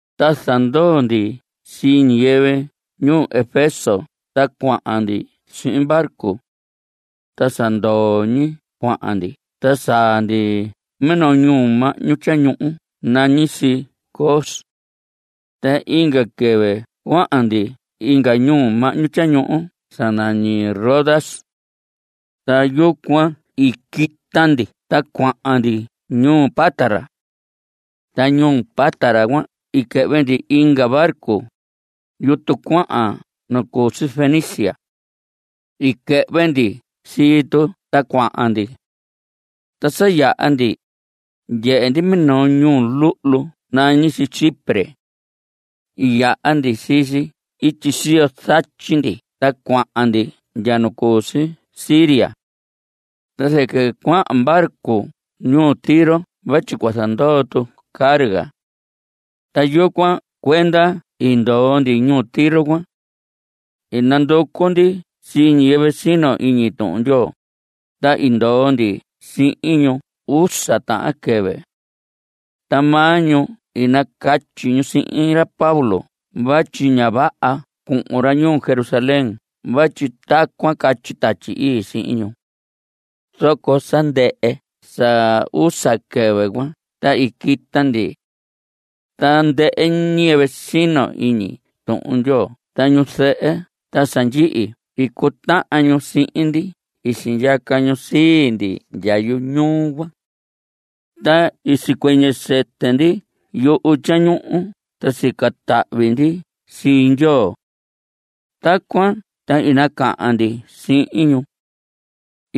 Ta zandoo ndi sii ñiyɨvɨ ñuu Efeso ta cuahan ndi sihin barco. Ta sa ndoo ñi cuahan ndi ta saa ndi minoo ñuhu mahñu tyañuhu nañi si Cos. Ta inga quɨvɨ cuahan ndi inga ñuhu mahñu tyañuhu sa nañi Rodas. Ta yucuan i quita ndi ta cuahan ndi ñuu Pátara. Ta ñuu Pátara cuan i quɨhvɨ ndi inga barco, yutu cuahan nu cu si Fenicia. I quɨhvɨ ndi sii tu ta cuahan ndi. Ta sa yaha ndi, ndyehe ndi minoo ñuhu luhlu nañi si Chipre. I yaha ndi sii si ityi siyo zatyi ndi ta cuahan ndi ndya nu cu si Siria. Ta zɨquɨ cuahan barco ñuu Tiro vatyi cua zandoo tu carga. Ta yucuan cuenda i ndoo ndi ñuu Tiro cuan. I nanducu ndi sii ñiyɨvɨ sino iñi Tuhun Ndyoo, ta i ndoo ndi sihin ñu usa tahan quɨvɨ. Ta maa ñu i nacatyi ñu sihin ra Pablo vatyi ña vaha cuhun ra ñuu Jerusalén vatyi tacuan catyi Tatyi Ii sihin ñu. Zoco sa ndɨhɨ sa usa quɨvɨ cuan ta i quita ndi. Tandɨhɨ ñiyɨvɨ sino iñi Tuhun Ndyoo ta ñu zɨhɨ ta sa ndyihi i cutahan ñu sihin ndi i sindyaca ñu sii ndi ndya yuñuu cuan. Ta i sicuɨñɨ sɨtɨ ndi yuhu tyañuhu ta sica tahvi ndi sii Ndyoo. Tacuan ta i nacahan ndi sihin ñu.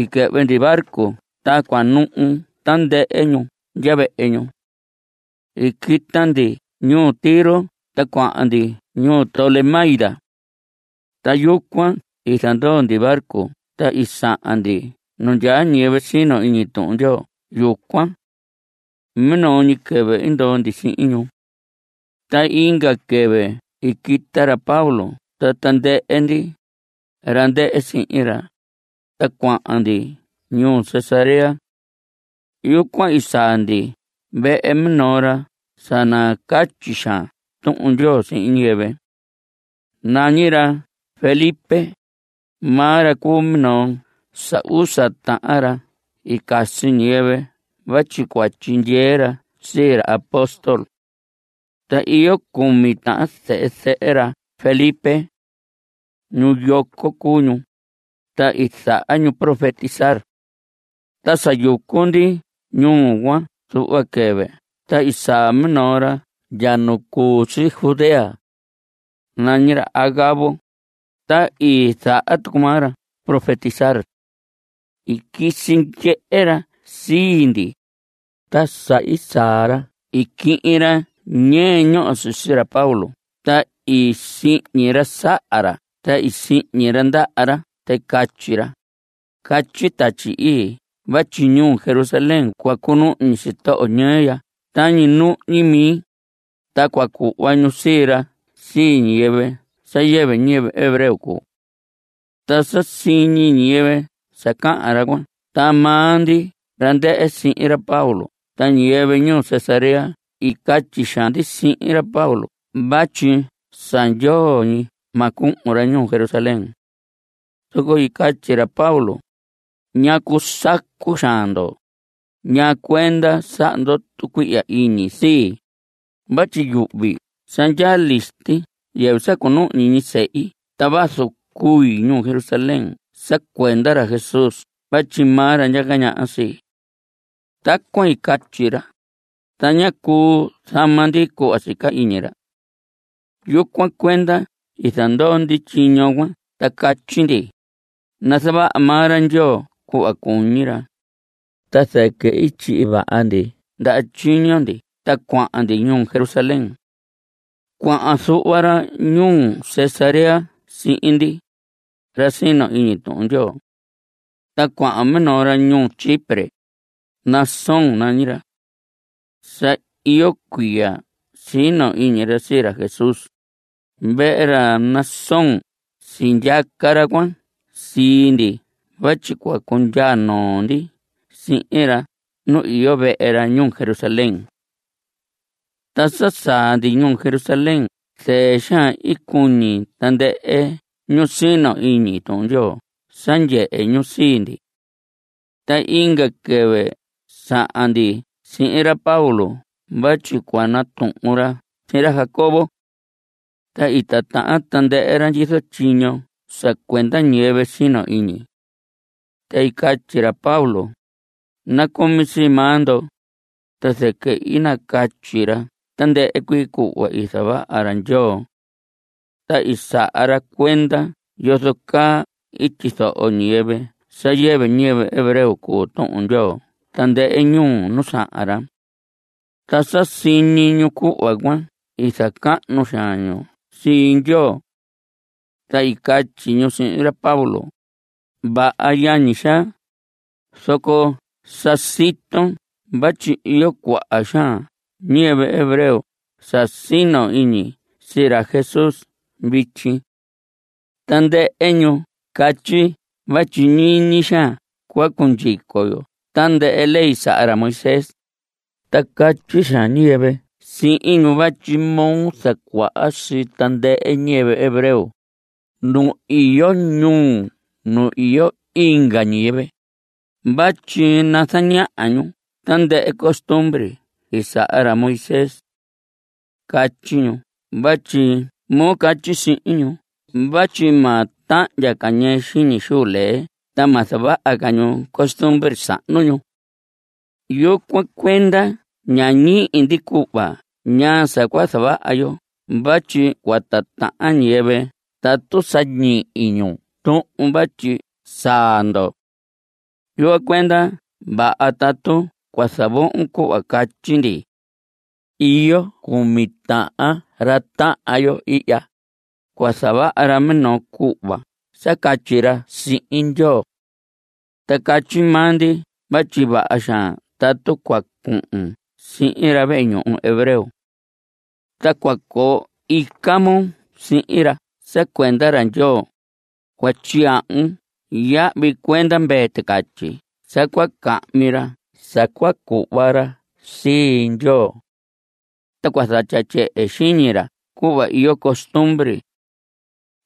I quɨhvɨ ndi barco ta cuanuhu tandɨhɨ ñu ndya vehe ñu. I quita ndi ñuu Tiro ta cuahan ndi ñuu Tolemaida. Ta yucuan i zandoo ndi barco ta i sahan ndi nu ndyaa ñiyɨvɨ sino iñi Tuhun Ndyoo yucuan. Minoo ñi quɨvɨ i ndoo ndi sihin ñu. Ta inga quɨvɨ i quita ra Pablo ta tandɨhɨ ndi, ra ndɨhɨ sihin ra, ta cuahan ndi ñuu Cesarea. Yucuan i saa ndi vehe minoo ra sa nacatyi xaan Tuhun Ndyoo sihin ñiyɨvɨ. Nañi ra Felipe. Maa ra cuu minoo sa usa tahan ra i casi ñiyɨvɨ vatyi cua tyindyee ra sii ra apóstol. Ta iyo cumi tahan zehe zɨhɨ ra Felipe. Ñu yoco cuu ñu. Ta i zaha ñu profetizar. Ta sa yucu ndi ñuu cuan zuhva quɨvɨ ta i saa minoo ra ndya nu cu si Judea. Nañi ra Agabo. Ta i zaha tucu maa ra profetizar. I quisi ndyehe ra sii ndi. Ta sa i saa ra i quihin ra ñɨɨ ñoho sisi ra Pablo ta i sihñi ra saha ra ta i sihñi ra ndaha ra ta i catyi ra: Catyi Tatyi Ii vatyi ñuu Jerusalén cua cunuhñi sitoho ñɨɨ ya tañi nuhñi mi, ta cua cuhva ñu sii ra sii ñiyɨvɨ sa yɨvɨ ñiyɨvɨ hebreo cuu. Ta sa siñi ñiyɨvɨ sa cahan ra cuan ta maa ndi ra ndɨhɨ sihin ra Pablo ta ñiyɨvɨ ñuu Cesarea i catyi xaan ndi sihin ra Pablo vatyi sa ndyoo ñi ma cuhun ra ñuu Jerusalén. Zoco i catyi ra Pablo: ¿Ñacu sacu xaan ndo? ¿Ñaa cuenda saha ndo tucuihya iñi sii? Vatyi yuhvi sa ndyaa listi yɨvɨ sa cunuhñi ñi sehi ta vazu cui ñuu Jerusalén sa cuenda ra Jesús vatyi maa ra ndyaca ñaha sii. Tacuan i catyi ra, ta ñá cuu zama ndi cuhva sica iñi ra. Yucuan cuenda i zandoo ndi tyiño cuan ta catyi ndi: Nazavaha maa ra Ndyoo cuhva cuñi ra. Ta zɨquɨ i tyihi vaha ndi ndaha tyiño ndi ta cuahan ndi ñuu Jerusalén. Cuahan zuhva ra ñuu Cesarea sihin ndi, ra sino iñi Tuhun Ndyoo. Ta cuahan minoo ra ñuu Chipre. Mnasón nañi ra. Sa iyo cuiya sino iñi ra sii ra Jesús. Vehe ra Mnasón sindyaca ra cuan sii ndi vatyi cua cundyaa noo ndi sihin ra nu iyo vehe ra ñuu Jerusalén. Ta sa saa ndi ñuu Jerusalén zɨɨ xaan i cuñi tandɨhɨ ñu sino iñi Tuhun Ndyoo sa ndyehe ñu sii ndi. Ta inga quɨvɨ sahan ndi sihin ra Pablo vatyi cua natuhun ra sihin ra Jacobo. Ta i titahan tandɨhɨ ra ndyizo tyiño sa cuenda ñiyɨvɨ sino iñi. Ta i catyi ra Pablo: Nacumi sii maa ndo. Ta zɨquɨ i nacatyi ra tandɨhɨ cuii cuhva i zavaha ra Ndyoo. Ta i saha ra cuenda yozo caa i tyizoho ñiyɨvɨ sa yɨvɨ ñiyɨvɨ hebreo cuu Tuhun Ndyoo tandɨhɨ ñuu nu sahan ra. Ta sa siñi ñu cuhva cuan i zacahnu xaan ñu sii Ndyoo. Ta i catyi ñu sihin ra Pablo: Vaha yañi xaa, zoco sa siton vatyi iyo cuaha xaan ñiyɨvɨ hebreo sa sino iñi sii ra Jesús vityi. Tandɨhɨ ñu catyi vatyi ñiñi xaan cua cundyico yo tandɨhɨ ley saha ra Moisés. Ta catyi xaan ñiyɨvɨ sihin ñu vatyi moo zacuaha sii tandɨhɨ ñiyɨvɨ hebreo, ñu iyo ñuu nu iyo inga ñiyɨvɨ, vatyi nazaña ñu tandɨhɨ costumbre i saha ra Moisés. Catyi ñu vatyi moo catyi sihin ñu vatyi ma tahndya ca ñɨɨ xiñi xuu lee ta ma zavaha ca ñu costumbre sahnu ñu. Yucuan cuenda ña ñihi ndi cuhva ñaa sa cua zavaha yo vatyi cua titahan ñiyɨvɨ tatu sa ñihi ñu tuhun vatyi saa ndo. Yucuan cuenda vaha tatu cua zavohon cuhva catyi ndi. Iyo cumi tahan ra tahan yo ihya. Cua zavaha ra minoo cuhva sa catyi ra sihin Ndyoo. Ta catyi maa ndi vatyi vaha xaan tatu cua cuhun sihin ra vehe ñuhu hebreo. Ta cua coo ica moo sihin ra sa cuenda ra Ndyoo. Cua tyiyahvun yahvi cuenda mvee ticatyi sa cua cahmi ra sa cua cuhva ra sii Ndyoo. Ta cua zatya tyehe xiñi ra cuhva iyo costumbre.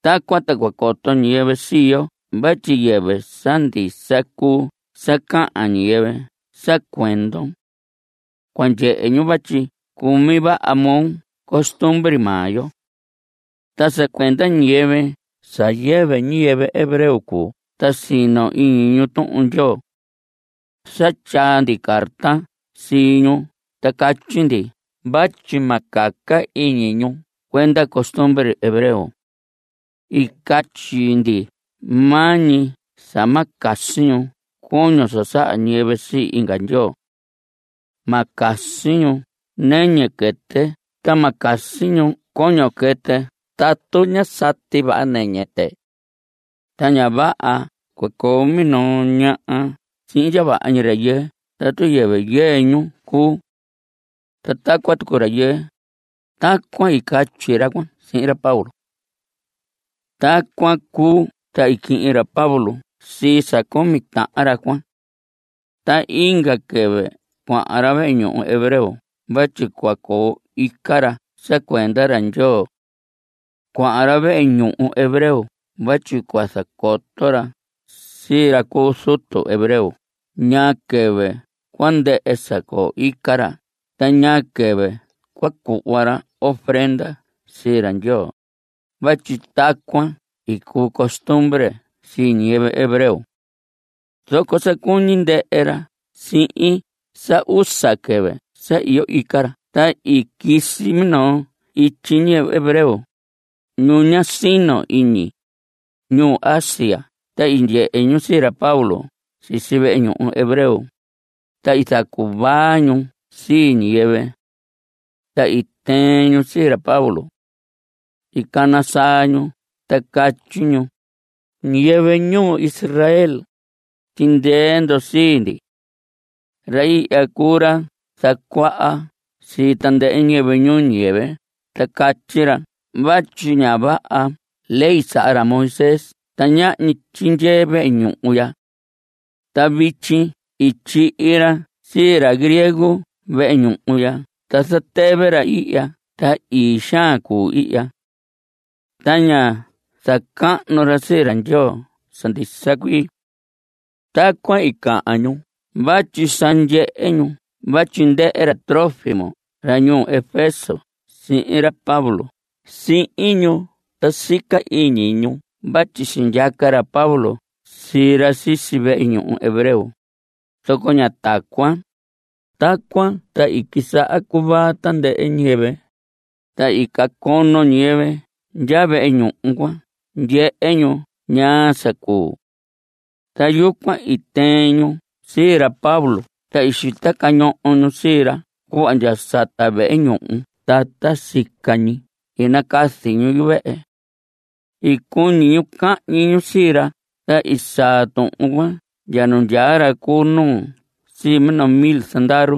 Tacuan ta cua coto ñiyɨvɨ sii yo vatyi yɨvɨ sa ndisa cuu sa cahan ñiyɨvɨ sa cuendon. Cua ndyehe ñu vatyi cumi vaha moo costumbre maa yo. Ta sa cuenda ñiyɨvɨ sa yɨvɨ ñiyɨvɨ hebreo cuu ta sino iñi ñu Tuhun Ndyoo. Sa tyaa ndi carta sii ñu ta catyi ndi vatyi ma caca iñi ñu cuenda costumbre hebreo. I catyi ndi maa ñi sa ma casi ñu coño sa saha ñiyɨvɨ sii inga ndyoo. Ma casi ñu nɨñɨ quɨtɨ ta ma casi ñu coño quɨtɨ tatu ñá sati vaha nɨñɨ tɨ. Ta ña vaha cua coo minoo ñaha sihin ndya vaha ñi rayɨɨ tatu yɨvɨ yɨɨ ñu cuu. Ta tacuan tucu rayɨɨ. Tacuan i catyi ra cuan sihin ra Pablo. Tacuan cuu ta i quihin ra Pablo sii sa cumi tahan ra cuan. Ta inga quɨvɨ cuahan ra vehe ñuhu hebreo vatyi cua coo ica ra sa cuenda ra Ndyoo. Cuahan ra vehe ñuhu hebreo vatyi cua zacoto ra sii ra cu zutu hebreo ñaa quɨvɨ cua ndɨhɨ sa coo ica ra ta ñaa quɨvɨ cua cuhva ra ofrenda sii ra Ndyoo (vatyi tacuan i cuu costumbre sii ñiyɨvɨ hebreo). Zoco sa cuñi ndɨhɨ ra sihin sa usa quɨvɨ sa iyo ica ra ta i quisi minoo ityi ñiyɨvɨ hebreo, ñu ña sino iñi, ñu Asia ta i ndyehe ñu sii ra Pablo sisi vehe ñuhu hebreo, ta i zacuvaa ñu sii ñiyɨvɨ. Ta i tɨɨn ñu sii ra Pablo. I cana saa ñu ta catyi ñu: Ñiyɨvɨ ñuu Israel, tyindyee ndo sii ndi. Ra ihya cuu ra zacuaha sii tandɨhɨ ñiyɨvɨ ñuu ñiyɨvɨ ta catyi ra vatyi ña vaha ley saha ra Moisés ta ñahñi tyindyee vehe ñuhu ya. Ta vityi i tyihi ra sii ra griego vehe ñuhu ya ta zatɨvɨ ra ihya ta ii xaan cuu ihya. Ta ña zacahnu ra sii ra Ndyoo sa ndisa cuii. Tacuan i cahan ñu vatyi sa ndyehe ñu vatyi ndɨhɨ ra Trófimo ra ñuu Efeso sihin ra Pablo si ñuu ta sica iñi ñu vatyi sindyaca ra Pablo sii ra sisi vehe ñuhu hebreo, zoco ña tacuan. Tacuan ta i quisaha cuvaa tandɨhɨ ñiyɨvɨ, ta i cacono ñiyɨvɨ ndya vehe ñuhu cua ndyehe ñu ñaa sa cuu. Ta yucuan i tɨɨn ñu sii ra Pablo ta i xita cañoho ñu sii ra cuhva ndya sata vehe ñuhu ta ta sica ñi i nacazi ñu yuvehe. I cuñi ñu cahñi ñu sii ra ta i saa tuhun cuan ndya nu ndyaa ra cu nuu sii minoo mil zandaru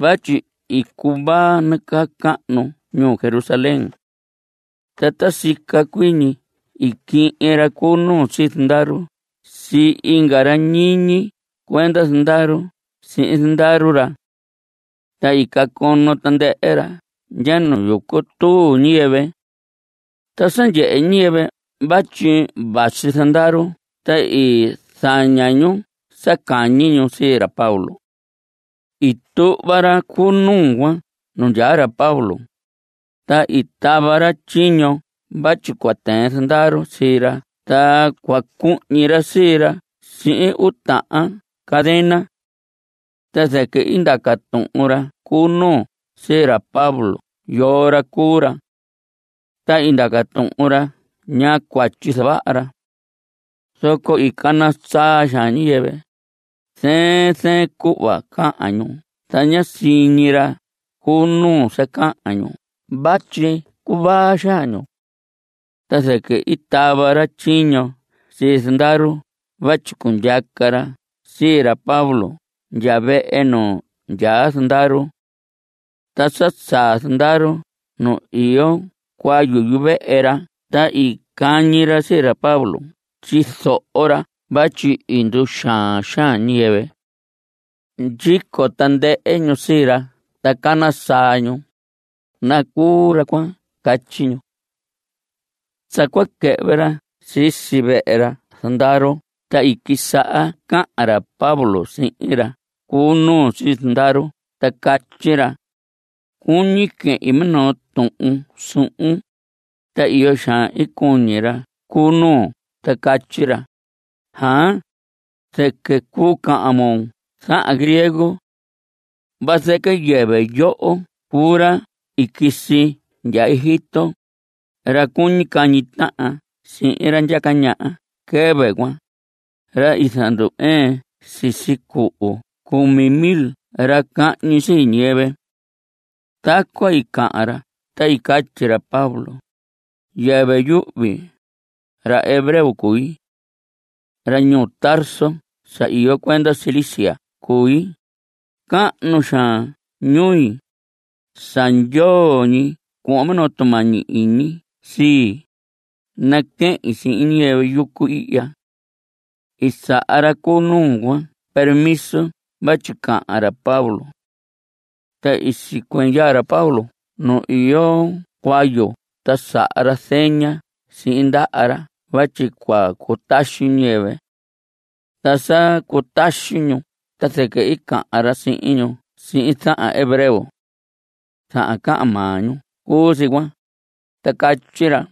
vatyi i cuvaa nacahnu ñuu Jerusalén. Ta ta sica cuii ñi i quihin ra cu nuu sii zandaru sii inga ra ñiñi cuenda zandaru sihin zandaru ra. Ta i cacono tandɨhɨ ra ndya nu yucu tuu ñiyɨvɨ. Ta sa ndyehe ñiyɨvɨ vatyi vasi zandaru ta i zaña ñu sa cañi ñu sii ra Pablo. I tuhva ra cu nuu cuan nu ndyaa ra Pablo, ta i tava ra tyiño vatyi cua tɨɨn zandaru sii ra ta cua cuhñi ra sii ra sihin uu tahan cadena. Ta zɨquɨ i ndaca tuhun ra cu nuu sii ra Pablo yoo ra cuu ra. Ta i ndaca tuhun ra ñaa cuatyi i zavaha ra. Zoco i cana saa xaan ñiyɨvɨ. Zɨɨn zɨɨn cuhva cahan ñu ta ñá siñi ra cu nuu sa cahan ñu vatyi cuvaa xaan ñu. Ta zɨquɨ i tava ra tyiño sii zandaru vatyi cundyaca ra sii ra Pablo ndya vehe nu ndyaa zandaru. Ta sa saa zandaru nu iyo cuayu yuvehe ra ta i cañihi ra sii ra Pablo ndyizo ra vatyi i nduxaan xaan ñiyɨvɨ. Ndyico tandɨhɨ ñu sii ra ta cana saa ñu: ¡Nacuu ra cuan! Catyi ñu. Sa cua quɨhvɨ ra sisi vehe ra zandaru ta i quisaha cahan ra Pablo sihin ra cu nuu sii zandaru ta catyi ra: Cuñi quehin minoo tuhun suhun. Ta iyo xaan i cuñi ra cu nuu ta catyi ra: Aan, zɨquɨ cuu cahan moo zahan griego. Vazɨquɨ yɨvɨ yoho cuu ra i quisi ndya Egipto, ra cuñi cahñi tahan sihin ra ndyaca ñaha quɨvɨ cuan, ra i zandu‑ɨɨn sisi cuhu cumi mil ra cahñi sii ñiyɨvɨ. Tacuan i cahan ra ta i catyi ra Pablo: Yɨvɨ yuhvi. Ra hebreo cui. Ra ñuu Tarso sa iyo cuenda Cilicia cui. Cahnu xaan ñui. Sa ndyoo ñi cuhvon minoo tumañi iñi sii, naquehin sihin ñiyɨvɨ yucu ihya. I saha ra cu nuu cuan permiso vatyi cahan ra Pablo. Ta i sicuɨñɨ ndyaa ra Pablo nu iyo cuayu ta saha ra zeña sihin ndaha ra vatyi cua cutaxi ñiyɨvɨ. Ta sa cutaxi ñu ta zɨquɨ i cahan ra sihin ñu sihin zahan hebreo. Zahan cahan maa ñu cuu si cuan. Ta catyi ra: